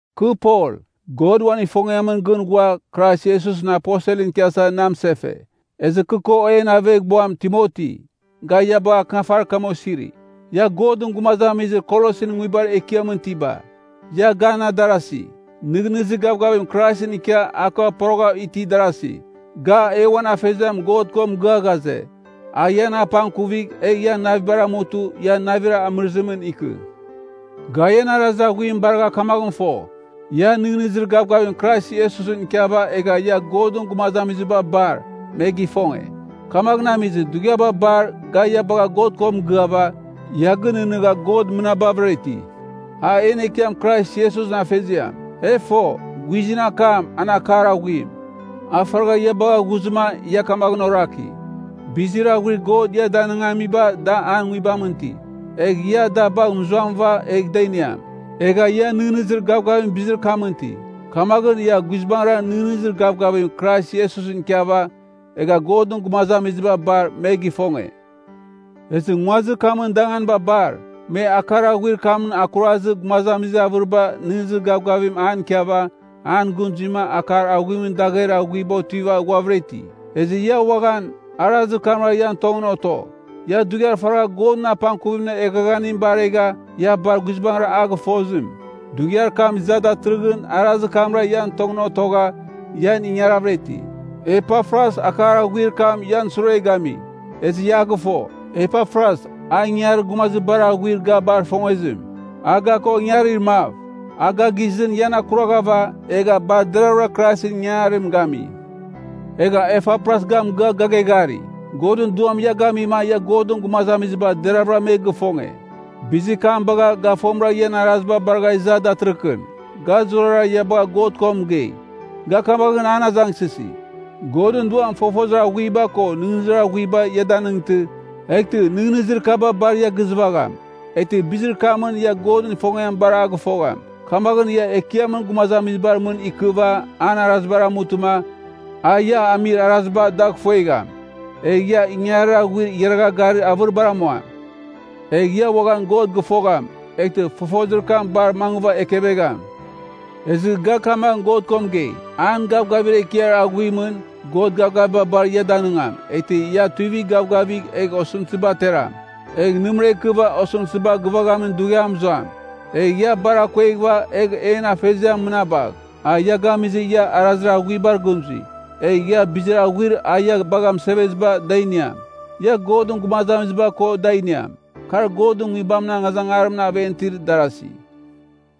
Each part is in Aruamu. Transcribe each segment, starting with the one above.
Kɨ Pol, God uan ifongiamɨn gɨn ghua Krais Iesusɨn aposelɨn ikiasa na mɨsefe. Ezɨ kɨ ko en aveghbuam Timoti, ga ia bagha akɨnafarir kam osiri. Ia Godɨn gumazamizir Kolosin nguibar ekiamɨn itiba, ia gan adarasi, nɨghnɨzir gavgavim Kraisɨn ikia a ko poroghav itir darasi. Ga, e uan Afeziam God ko mɨgɨa ghaze, a ian apangkuvigh egh ian navibar amutɨ ia navir amɨrɨzimɨn ikɨ. Ga ian arazir aghuim baragha kamaghɨn fo, ia nɨghnɨzir gavgavim Krais Iesusɨn ikiava egha ia Godɨn gumazamiziba bar, me gifonge. Kamaghɨn amizɨ, dughiaba bar ga ia bagha God ko mɨgɨava, ia gɨnɨghnɨgha God mɨnabavɨra iti. A en Ekiam Krais Iesusɨn Afeziam. E fo, guizɨn akam, an akar aghuim, a faragha ia bagha ghuzɨma ia kamaghɨn oraki, bizir aghuir God ia danɨngamiba da An Nguibamɨn iti, egh ia da bagh mɨzuamɨva egh da iniam. Egha ia nɨghnɨzir gavgavim bizir kamɨn iti. Kamaghɨn, ia guizbangɨra nɨghnɨzir gavgavim Krais Iesusɨn ikiava egha Godɨn gumazamiziba bar, me gifonge. Ezɨ nguazir kamɨn danganiba bar, me akar aghuir kamɨn akurazɨ gumazamizir avɨriba nɨghnɨzir gavgavim an ikiava an gɨn zuima akar aghuimɨn dagher aghuiba otiva ghuavɨra iti. Ezɨ ia uaghan, arazir kamra ian tongɨn oto. Ia dughiar faragha Godɨn apangkuvimɨn eghaghanim baregha ia bar guizbangɨra a gɨfozim, dughiar kam iza datɨrɨghɨn arazir kamra ian tongɨn otogha, ian ingaravɨra iti. Epafras akar aghuir kam ian sure gami, ezɨ ia a gɨfo. Epafras, a ingangarir gumazir bar aghuir ga bar ifongezim, a ga ko ingarir mav. A ga gisɨn ian akurvagha, egha bar deravɨra Kraisɨn ingangarim gami. Egha Epafras ga mɨgɨa ga geghari, Godɨn Duam ia gamima ia Godɨn gumazamiziba deraghavɨra me gifonge. Bizir kam bagha, ga fomɨra ian araziba baragha iza datɨrɨkɨn, ga zurara ia bagha God ko mɨgei. Ga kamaghɨn an azangsɨsi, Godɨn Duam fofozir aghuiba ko nɨghnɨzir aghuiba ia danɨngtɨ, eghtɨ nɨghnɨzir kaba bar ia gizɨvagham. Eghtɨ bizir kamɨn ia Godɨn ifongiam bar a gɨfogham. Kamaghɨn ia Ekiamɨn gumazamizibar mɨn ikɨva an arazibar amutɨma, a ia amir araziba dagh ifuegham. Egh ia ingangarir aghuir igharagha garir avɨribar amuam. Egh ia uaghan God gɨfogham, eghtɨ fofozir kam bar mangɨva ekevegham. Ezɨ ga kamaghɨn God ko mɨgei, an gavgavir ekiar aghuimɨn, God gavgaviba bar ia danɨngam, eghtɨ ia tuivigh gavgavigh egh osɨmtɨziba ateram, egh nɨmɨra ikɨva osɨmtɨziba gɨvaghamin dughiam mɨzuam. Egh ia bar akueghɨva, egh en Afeziam mɨnabagh. A ia gamizɨma ia arazir aghuibar gɨn zui, egh ia bizir aghuir a ia bagha mɨseveziba da iniam. Ia Godɨn gumazamiziba ko da iniam, kar Godɨn Nguibamɨn angazangarimɨn aven itir darasi.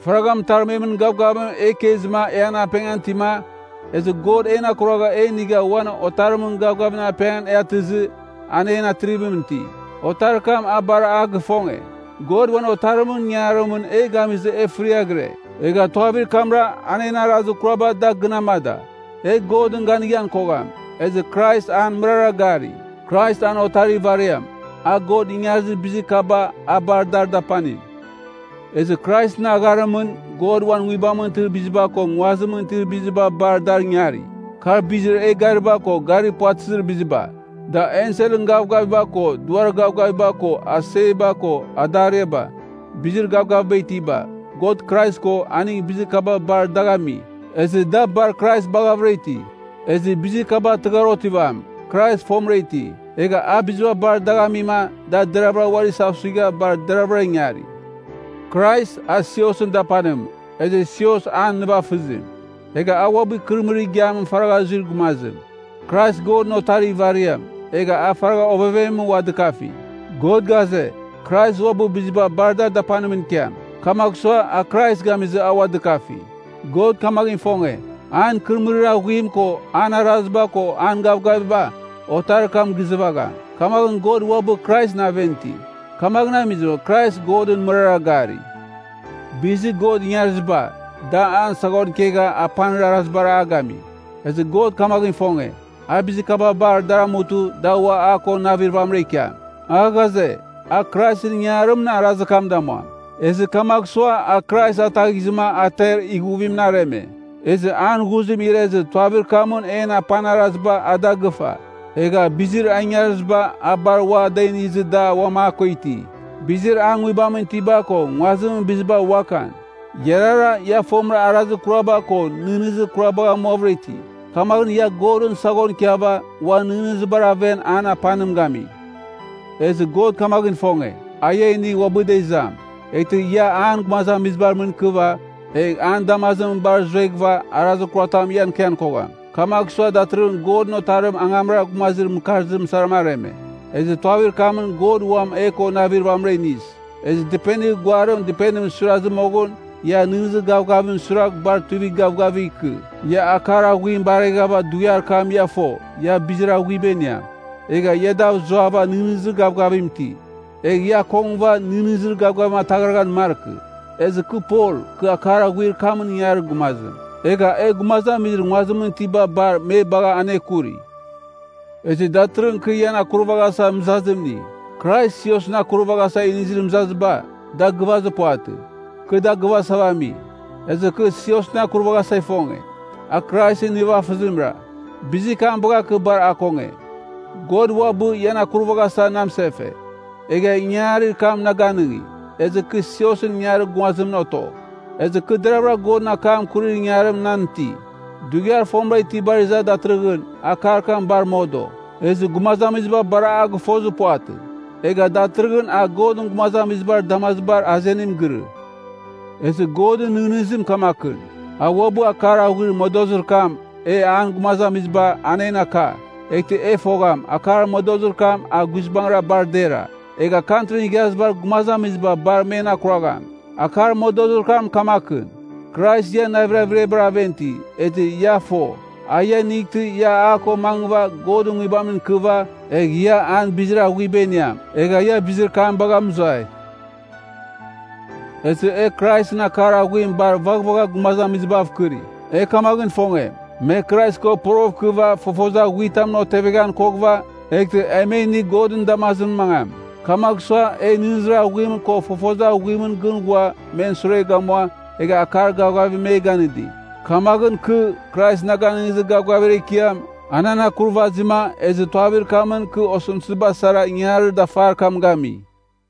Faragha mɨtarmemɨn gavgavim e ikezɨma e an apengan itima, ezɨ God en akuragha e inigha uan Otarimɨn gavgavimɨn apengan e atɨzɨ an en Atrivim iti, Otarir kam a bar a gifonge. God uan Otarimɨn ingangarimɨn e gamizɨ e fɨraghɨre, egha tuavir kamra an en arazir kuraba da gɨn amada. E Godɨn ganighan kogham, ezɨ Krais an mɨrara gari. Krais an Otarir ivariam, a God ingarizir bizir kaba a bar dar dapanim. Ezɨ Kraisɨn agharimɨn, God uan nguibamɨn itir biziba ko nguazimɨn itir biziba bar dar ingari. Kar bizir e gariba ko garir puvatɨzir biziba, da enselɨn gavgaviba ko duar gavgaviba ko aseba ko adariaba, bizir gavgaviba itiba. God Krais ko, aning bizir kaba bar dagh ami, ezɨ da bar Krais baghavɨra iti. Ezɨ bizir kaba tɨghar otivam, Krais fomɨra iti. Egha a biziba bar dagh amima da deravɨra uari isasuigha bar deravɨra ingari. Krais, a siosɨn dapanim, ezɨ sios an nivafɨzim. Egha a uabɨ ikɨrɨmɨrir igiamɨn faragha zuir gumazim. Krais Godɨn Otarir ivariam, egha a faragha ovevemɨn ua dɨkafi. God ghaze, Krais uabɨ biziba bar dar dapanimɨn ikiam. Kamagh sua, a Krais gamizɨ, a ua dɨkafi, God kamaghɨn ifonge, an ikɨrɨmɨrir aghuim ko an araziba ko an gavgaviba Otarir kam gizɨvagham, kamaghɨn God uabɨ Kraisɨn aven iti. Kamaghɨn amizɨ, Krais Godɨn mɨrara gari. Bizir God ingariziba, da an saghon ikegha apanir arazibar a gami. Ezɨ God kamaghɨn ifonge, a bizir kaba bar dar amutɨ da ua a ko navir vamɨra ikiam. A ghaze, a Kraisɨn ingangarimɨn arazir kam damuam. Ezɨ kamagh sua a Krais ataghizɨma a ter ighuvimɨn areme. Ezɨ an ghuzim irezɨ tuavir kamɨn en apanir araziba a da gɨfa. Egha bizir a ingariziba a bar ua da inizɨ da uam a ko iti, bizir an Nguibamɨn itiba ko nguazimɨn biziba uakan. Iarara, ia fomɨra arazir kuraba ko nɨghnɨzir kurabagh amuavɨra iti. Kamaghɨn ia Godɨn saghon ikiava uan nɨghnɨzibar aven an apanim gami. Ezɨ God kamaghɨn ifonge, a ia inigh uabɨda izam. Eghtɨ ia an gumazamizibar mɨn ikɨva, egh an damazimɨn bar zueghɨva, arazir kuratam ian ikian kogham. Kamagh sua datɨrɨghɨn Godɨn Otarim angamra gumazir mɨkarzim sara areme, ezɨ tuavir kamɨn God uam e ko navir vamɨra iniz. Ezɨ dɨpenir guarim dɨpenimɨn suirazɨ moghɨn, ia nɨghnɨzir gavgavimɨn suiragh bar tuivigh gavgavigh ikɨ. Ia akar aghuim bareghava dughiar kam ia fo ia bizir aghuiba iniam, egha ia dav zuava nɨghnɨzir gavgavim iti. Egh ia akongɨva nɨghnɨzir gavgavim ataghraghan markɨ. Ezɨ kɨ Pol, kɨ akar aghuir kamɨn ingangarir gumazim, egha e gumazamizir nguazimɨn itiba bar me bagha anekuri. Ezɨ datɨrɨghɨn kɨ ian akurvaghasa mɨzazim ini. Krais siosɨn akurvaghasa inizir mɨzaziba, da gɨvazir puvatɨ. Kɨ da gɨvasava ami. Ezɨ kɨ siosɨn akurvaghasa ifonge, a Kraisɨn nivafɨzimra. Bizir kam bagha kɨ bar akonge. God uabɨ, ian akurvaghasa na mɨsefe, egha ingangarir kam na ganɨngi, ezɨ kɨ siosɨn ingangarir gumazimɨn oto. Ezɨ kɨ deravɨra Godɨn akam akurir ingangarim nan iti. Dughiar fomɨra itibar iza datɨrɨghɨn, akar kam bar modo, ezɨ gumazamiziba bar a gɨfozir puvatɨ. Egha datɨrɨghɨn a Godɨn gumazamizibar damazibar azenim girɨ. Ezɨ Godɨn nɨghnɨzim kamakɨn, a uabɨ akar aghuir modozir kam e an gumazamiziba, an en aka, eghtɨ e fogham, akar modozir kam a guizbangɨra bar dera, egha Kantrin Igharazibar Gumazamiziba bar men akuragham. Akar modozir kam kamakɨn, Krais ian navir averiabar aven iti, ezɨ ia fo, a ia inightɨ ia a ko mangɨva Godɨn Nguibamɨn ikɨva, egh ia an bizir aghuiba iniam, egha ia bizir kam bagha mɨzuai. Ezɨ e Kraisɨn akar aghuim bar vaghvagha gumazamizibav kɨri. E kamaghɨn ifonge, me Krais ko porogh ikɨva fofozir aghuitamɨn oteveghan koghɨva, eghtɨ e me inigh Godɨn damazimɨn mangam. Kamagh sua, e nɨghnɨzir aghuim ko fofozir aghuimɨn gɨn ghua men sure gamua, egha akar gavgavim me ganɨdi. Kamaghɨn kɨ, Krais na ganɨngizir gavgavir ekiam, a nan akurvazima, ezɨ tuavir kamɨn kɨ osɨmtɨziba sara ingangarir dafar kam gami.